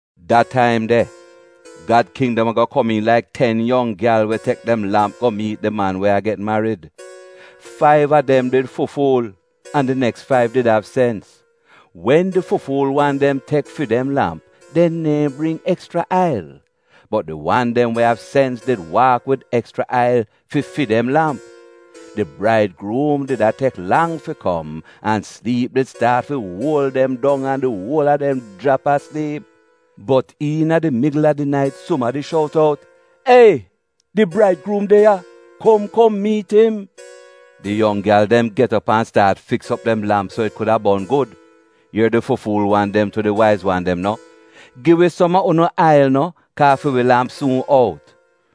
“Da taim de, Gad kindom ago komiin laik ten yong gyal we tek dem lamp go miit di man we a get marid. Faiv a dem did fu-fuul, an di neks faiv did av sens. Wen di fu-fuul wan dem tek fi dem lamp, dem neehn bring ekschra ail. Bot di wan dem we av sens did waak wid ekschra ail fi fi dem lamp. Di braidgruum did a tek lang fi kom, an sliip did staat fi uol dem dong an di uol a dem jrap a sliip. “Bot iina di migl a di nait sumadi shout out: ‘Ei, di braidgruum de ya! Kom kom miit im.’ “Di yong gyal dem get op an staat fiks op dem lamp so it kuda bon gud. Ier di fu-fuul wan dem tu di waiz wan dem no, ‘Gi wi som a unu ail no, kaa fi wi lamp suun out.’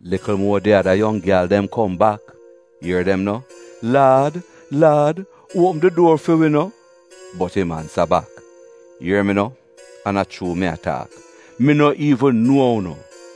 “Likl muo, di ada yong gyal dem kom bak. Ier dem no, ‘Laad, laad, uopm di duor fi wi no!’ “Bot im ansa bak, ‘Ier mi no, an a chuu mi a taak, mi no iivn nuo unu!’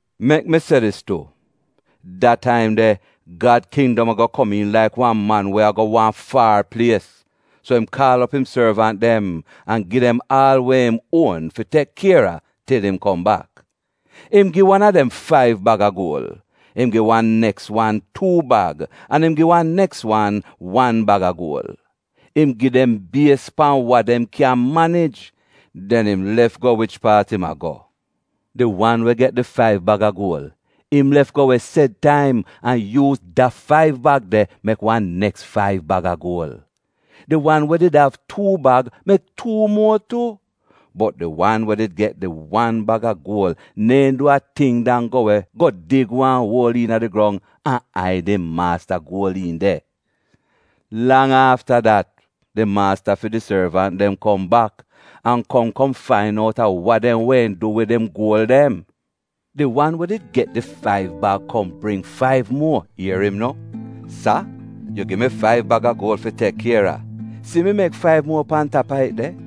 “Mek mi se dis tu, da taim de, Gad kindom ago komiin laik wan man we a go wan far plies, so im kaal op im sorvant dem an gi dem aal we im uon fi tek kier a til im kom bak. Im gi wan a dem faiv bag a guol, im gi wan neks wan tuu bag, an im gi wan neks wan wan bag a guol. Im gi dem bies pan wa dem kyan manij. Den im lef go wich paat im a go. Di wan we get di faiv bag a guol, im lef go we sed taim an yuuz da faiv bag de mek wan neks faiv bag a guol. Di wan we did av tuu bag mek tuu muo tu. Bot di wan we did get di wan bag a guol neehn du a ting dan go we go dig wan uol iina di grong an aid im maasta guol iin de. “Lang afta dat, di maasta fi di sorvant dem kom bak an kom kom fain out a wa dem wehn du wid im guol dem. Di wan we did get di faiv bag kom bring faiv muo, ier im no, ‘Sa, yu gi mi faiv bag a guol fi tek kier a. Si mi mek faiv muo pan tap a it de.’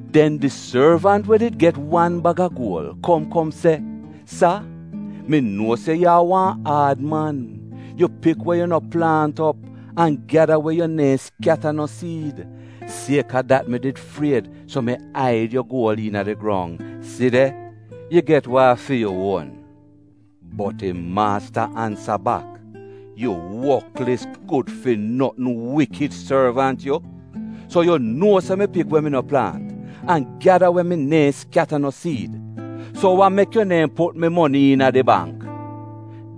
“Den di sorvant we did get di wan bag a guol kom kom se, ‘Sa, mi nuo se yu a wan aad man. Yu pik we yu no plaant op an gyada we yu neehn skyata no siid, sieka dat mi did fried, so mi aid yu guol iina di grong. Si de, yu get wa a fi yu uon.’ “Bot im maasta ansa bak, ‘Yu woklis, gud fi notn, wikid sorvant yu! So yu nuo se mi pik we mi no plaant an gyada we mi neehn skyata no siid? So wa mek yu neehn put mi moni iina di bangk?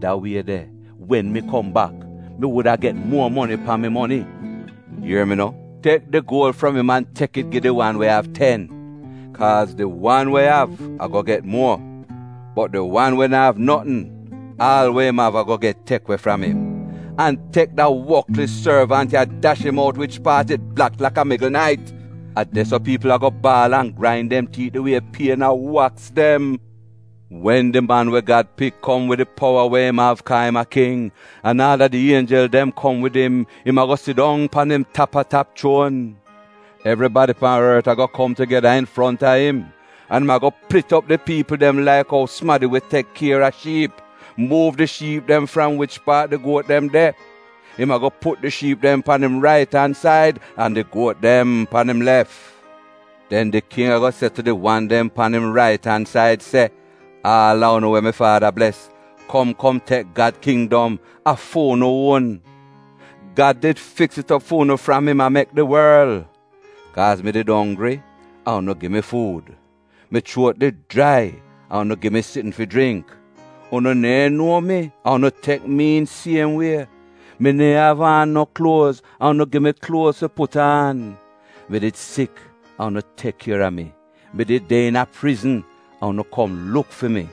Da wie de, wen mi kom bak, mi wuda get muo moni pan mi moni! “Ier mi no, tek di guol fram im an tek it gi di wan we av ten. Kaaz di wan we av, ago get muo. Bot di wan we na'av notn, aal we im av ago get tek we fram im. An tek da woklis sorvant ya dash im out wich paat it blak laka migl nait. A de-so piipl ago a baal an grain dem tiit di wie pien a waks dem.’ “Wen di Man we Gad Pik kom wid di powa we im av kaa im a king, an aal a di ienjel dem kom wid im, im ago sidong pan im tap-a-tap chuon. Evribadi pan ort ago kom tugeda infronta im, an im ago plit op di piipl dem laik ou sumadi we tek kier a shiip, muuv di shiip dem fram wich paat di guot dem de. Im ago put di shiip dem pan im rait-an-said an di guot dem pan im lef. “Den di king ago se tu di wan dem pan im rait-an-said se, ‘aal a unu we mi Faada bles, kom kom tek Gad Kindom, a fu'unu uon. Gad did fiks it op fu'unu fram im a mek di worl. Kaaz mi did onggri an unu gi mi fuud. Mi chuot did jrai an unu gi mi sitn fi jringk. Unu neehn nuo mi an unu tek mi iin siem wie. Mi neehn av aan no kluoz an unu gi mi kluoz fi put aan. Mi did sik an unu tek kier a mi. Mi did de iina prizn an unu kom luk fi mi.’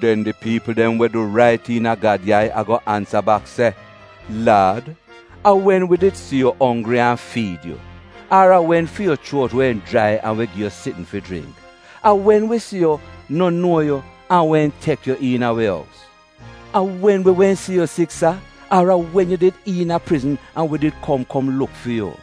“Den di piipl dem we du rait iina Gad yai ago ansa bak se, ‘Laad, a wen wi did si yu onggri an fiid yu, ar a wen fi yu chuot wehn jrai an wi gi yu sitn fi jringk? A wen wi si yu, no nuo yu, an wehn tek yu iina wi ous? A wen wi wehn si yu sik sa, ar a wen yu did iina prizn an wi did kom kom luk fi yu?’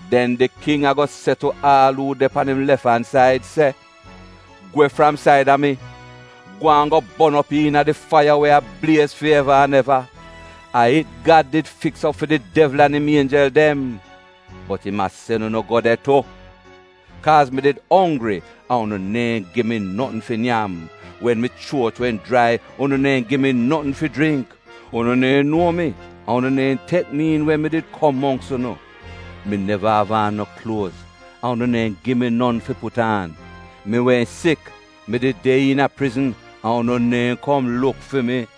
“Den di king ago se tu aal uu de pan im lef-an-said se, ‘Gwe fram saida mi! Gwaan go bon op iina di faiya we a bliez fi eva an eva. A it Gad did fiks op fi di devl an im ienjel dem, bot im a sen unu go de tu! Kaaz mi did onggri an unu neehn gi mi notn fi nyam. Wen mi chuot wehn jrai unu neehn gi mi notn fi jringk. Unu neehn nuo mi an unu neehn tek mi iin wen mi did kom mongks unu. Mi neva av aan no kluoz an unu neehn gi mi non fi put aan. Mi wehn sik, mi did de iina prizn an unu neehn kom luk fi mi.’